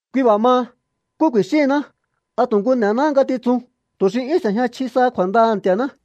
Kui b'a̱ maha, ¿nkú ku̱i̱xíhinná? ¿A tu̱ nku n'e̱náhá ngatitsun tu̱ xi 'yún s'e̱jña chji saha kju̱a̱ndaha̱ Nti̱a̱ná?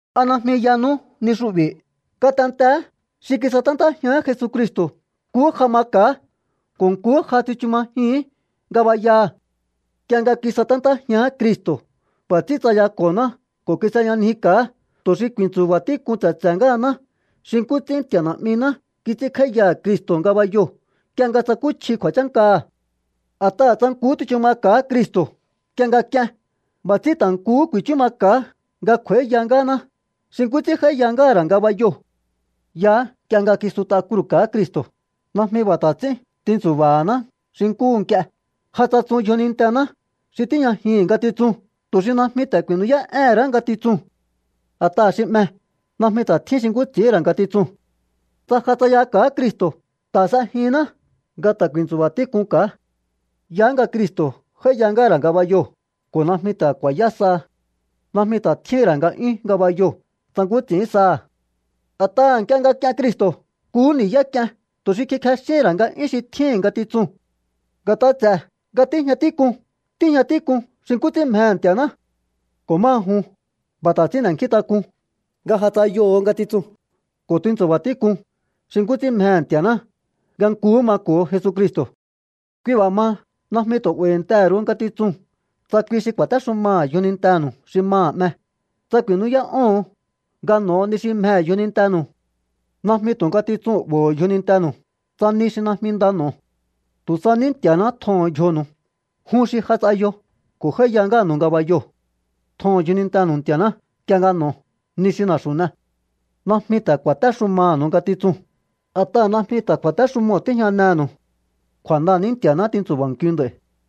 ¿A najmi yanú ni xu'bi̱? Ngatenteé xi kisaténtájián Jesucristo̱ nkuhú ja maka̱á ko̱ nkuhú ja tsichu majihi̱ín ngabayaha̱. Nk'ie nga kisaténtájián Cristo̱, b'a̱ ts'ín tsayako̱honá ko̱ kis'eyanjika̱á, tu̱ xi ku̱i̱ntsu̱ba̱ tík'un tse̱tse̱ ngáhaná xi nkú ts'ín Nti̱a̱ Na̱'miná kits'ínkj'áíyaha̱ Cristo̱ ngabayoo̱ nk'ie nga tsakúchji kju̱a̱chánkaha̱. A̱t'aha̱ tsa nkuhú tsichu maka̱á Cristo̱ nk'ie nga k'ien, b'a̱ ts'ín ta̱ nkuhú ku̱i̱chú maka̱á nga kj'u̱a̱íya ngáhaná xi nkú ts'ín j'áíya ngáha̱ ra̱ ngabayoo̱. Yaá nk'ie nga kisut'a kruu̱ka̱á Cristo̱. Najmi b'a̱ ta̱ ts'ín tintsu̱ba̱haná xi nkúhu nk'ie. Ja tsatsun yjonintená xi tíjñajihi̱n ngatitsun tu̱ xi najmi ta̱ ku̱i̱nú'yá'éhe̱n ra̱á ngatitsuu̱n. A̱t'aha̱ xi 'me, najmi ta̱ tjín xi nkú ts'i̱íhi̱n ra̱ ngatitsuu̱n. Tsa ja tsayaka̱á Cristo̱, ta̱ s'ejinná nga ta̱ ku̱i̱ntsu̱ba̱ tík'unka̱á. Yaá nga Cristo̱ j'áíya ngáha̱ ra̱ ngabayoo̱ ko̱ najmi ta̱ ku̱a̱yá saha. Najmi ta̱ tjíhi̱n ra̱ nga'yún ngabayoo̱ tsa nkú ts'i̱ín saha̱. A̱t'aha̱ nk'ie nga k'ien Cristo̱, nkuhú ni̱yá k'iehen tu̱ xi kikjexíhi̱n ra̱ nga'yún xi tjíhi̱n ngatitsuu̱n. Nga̱t'a ts'e̱ nga tíjña tík'un, tíjña tík'un xi nkú ts'ín mjehe̱ Nti̱a̱ná. Ko̱ máha jun, b'a̱ ta̱ ts'ín n'e̱nkjíntak'un nga ja tsayoho̱ ngatitsuu̱n ko̱ tintsu̱ba̱ tík'un xi nkú ts'ín mjehe̱ Nti̱a̱ná, nga nkuhú mako̱o Jesucristo̱. Kui b'a̱ maha, najmi tu̱ 'ba̱i̱ntehe̱ ru̱u ngatitsuu̱n tsa kui xi ku̱a̱téxumaha̱ yjonintenu̱u xi maha̱ 'me, tsa ku̱i̱nú'yá'óho̱on nga n'o̱o ni xi mjehe̱ yjonintenu̱u. Najmi tu̱ ngatitsuu̱n 'bo̱ho̱ yjonintenu̱u, tsa ni xi najmi nda n'o̱o. Tu̱ sa ní Nti̱a̱ná tjoho̱n yjonu̱u, jun xi ja tsayo ko̱ j'áíya ngáha̱nu̱u ngabayoo̱. Tjoho̱n yjonintenu̱u Nti̱a̱ná nk'ie nga n'o̱o ni xi na̱xu̱ n'e. Najmi ta̱ ku̱a̱téxumaha̱nu̱u ngatitsuu̱n, a̱t'aha̱ najmi ta̱ kju̱a̱téxumoo̱ tíjñanehe̱nu̱u. Kju̱a̱ndaha̱ ní Nti̱a̱ná tintsu̱ba̱nkiu nd'a̱i̱.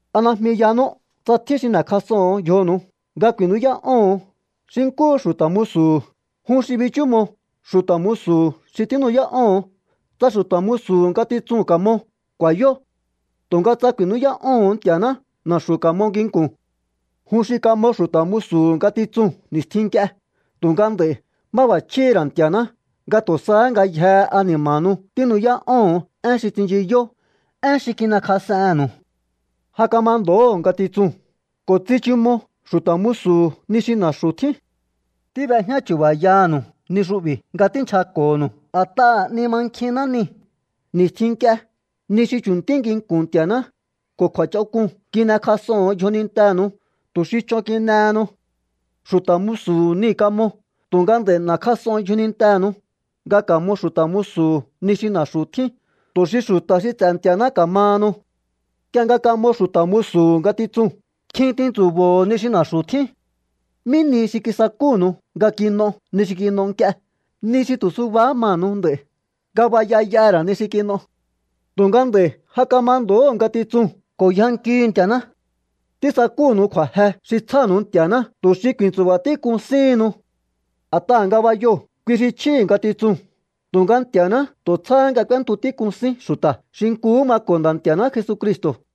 ¿A najmi yanú, tsa tjín xi n'e̱kjas'oho̱on yjonu̱u nga ku̱i̱nú'yá'óho̱on xi nkúhu xu̱ta̱ musu̱hu̱, jun xi bichúmo xu̱ta̱ musu̱hu̱ xi tínu'yá'óho̱on? Tsa xu̱ta̱ musu̱hu̱ ngatitsuu̱n ka̱mo, ku̱a̱yó. Tu̱nga tsa ku̱i̱nú'yá'óho̱on Nti̱a̱ná, na̱xu̱ ka̱mo nginku̱n. Jun xi kamo xu̱ta̱ musu̱hu̱ ngatitsuu̱n ni̱stjin nk'ie, tu̱nga nd'a̱i̱ máb'a̱chjíhi̱ ra̱ Nti̱a̱ná nga tu̱ sahá ngayjehe ani̱ma̱nu̱u tínu'yá'óho̱on én xi tsinchiyó, én xi kin'ekjas'ennu̱u. Ja kamando̱óho̱ ngatitsuu̱n ko̱ tsichumo xu̱ta̱ musu̱hu̱ ni xi na̱xu̱ tjín. Tíb'ejñá chu̱ba̱yanu̱u ni xu'bi̱ nga tínchjako̱nu̱u a̱t'aha̱ 'ni mankjinná nii̱. Ni̱stjin nk'ie, ni xi chu̱ntí nginku̱n Nti̱a̱ná ko̱ kju̱a̱ch'onk'uu̱n kin'ekjas'oho̱on yjonintenu̱u tu̱ xi ch'on kin'ehenu. Xu̱ta̱ musu̱hu̱ niu̱ kamo, tu̱nga nd'a̱i̱ n'e̱kjas'on yjonintenu̱u nga ka̱mo xu̱ta̱ musu̱hu̱ ni xi na̱xu̱ tjín tu̱ xi xu̱ta̱ xi ts'e̱ Nti̱a̱ná ka̱mahanu. Nk'ie nga kamo xu̱ta̱ musu̱hu̱ ngatitsuu̱n, kjin tintsu̱bo̱ho̱ ni xi na̱xu̱ tjín. ¿Mí nihi xi kisakúnu̱u nga kin'o ni xi kin'o nk'ie, ni xi tu̱ subahá manu̱u nd'a̱i̱? Ngabaya y'aha̱ ra̱ ni xi kin'o. Tu̱nga nd'a̱i̱ ja kamando̱óho̱ ngatitsuu̱n ko̱ yjankihu̱u Nti̱a̱ná. Tísakúnu̱u kju̱a̱je xi tsjánu̱u Nti̱a̱ná tu̱ xi ku̱i̱ntsu̱ba tík'un síhinnu. A̱t'aha̱ ngabayoo̱, kui xi chjíhi̱ ngatitsuu̱n, tu̱nga Nti̱a̱ná tu̱ tsjáhá nga k'úéntu tík'un sín xu̱ta̱ xi nkuhú mako̱ Nda̱ Nti̱a̱ná Jesucristo̱.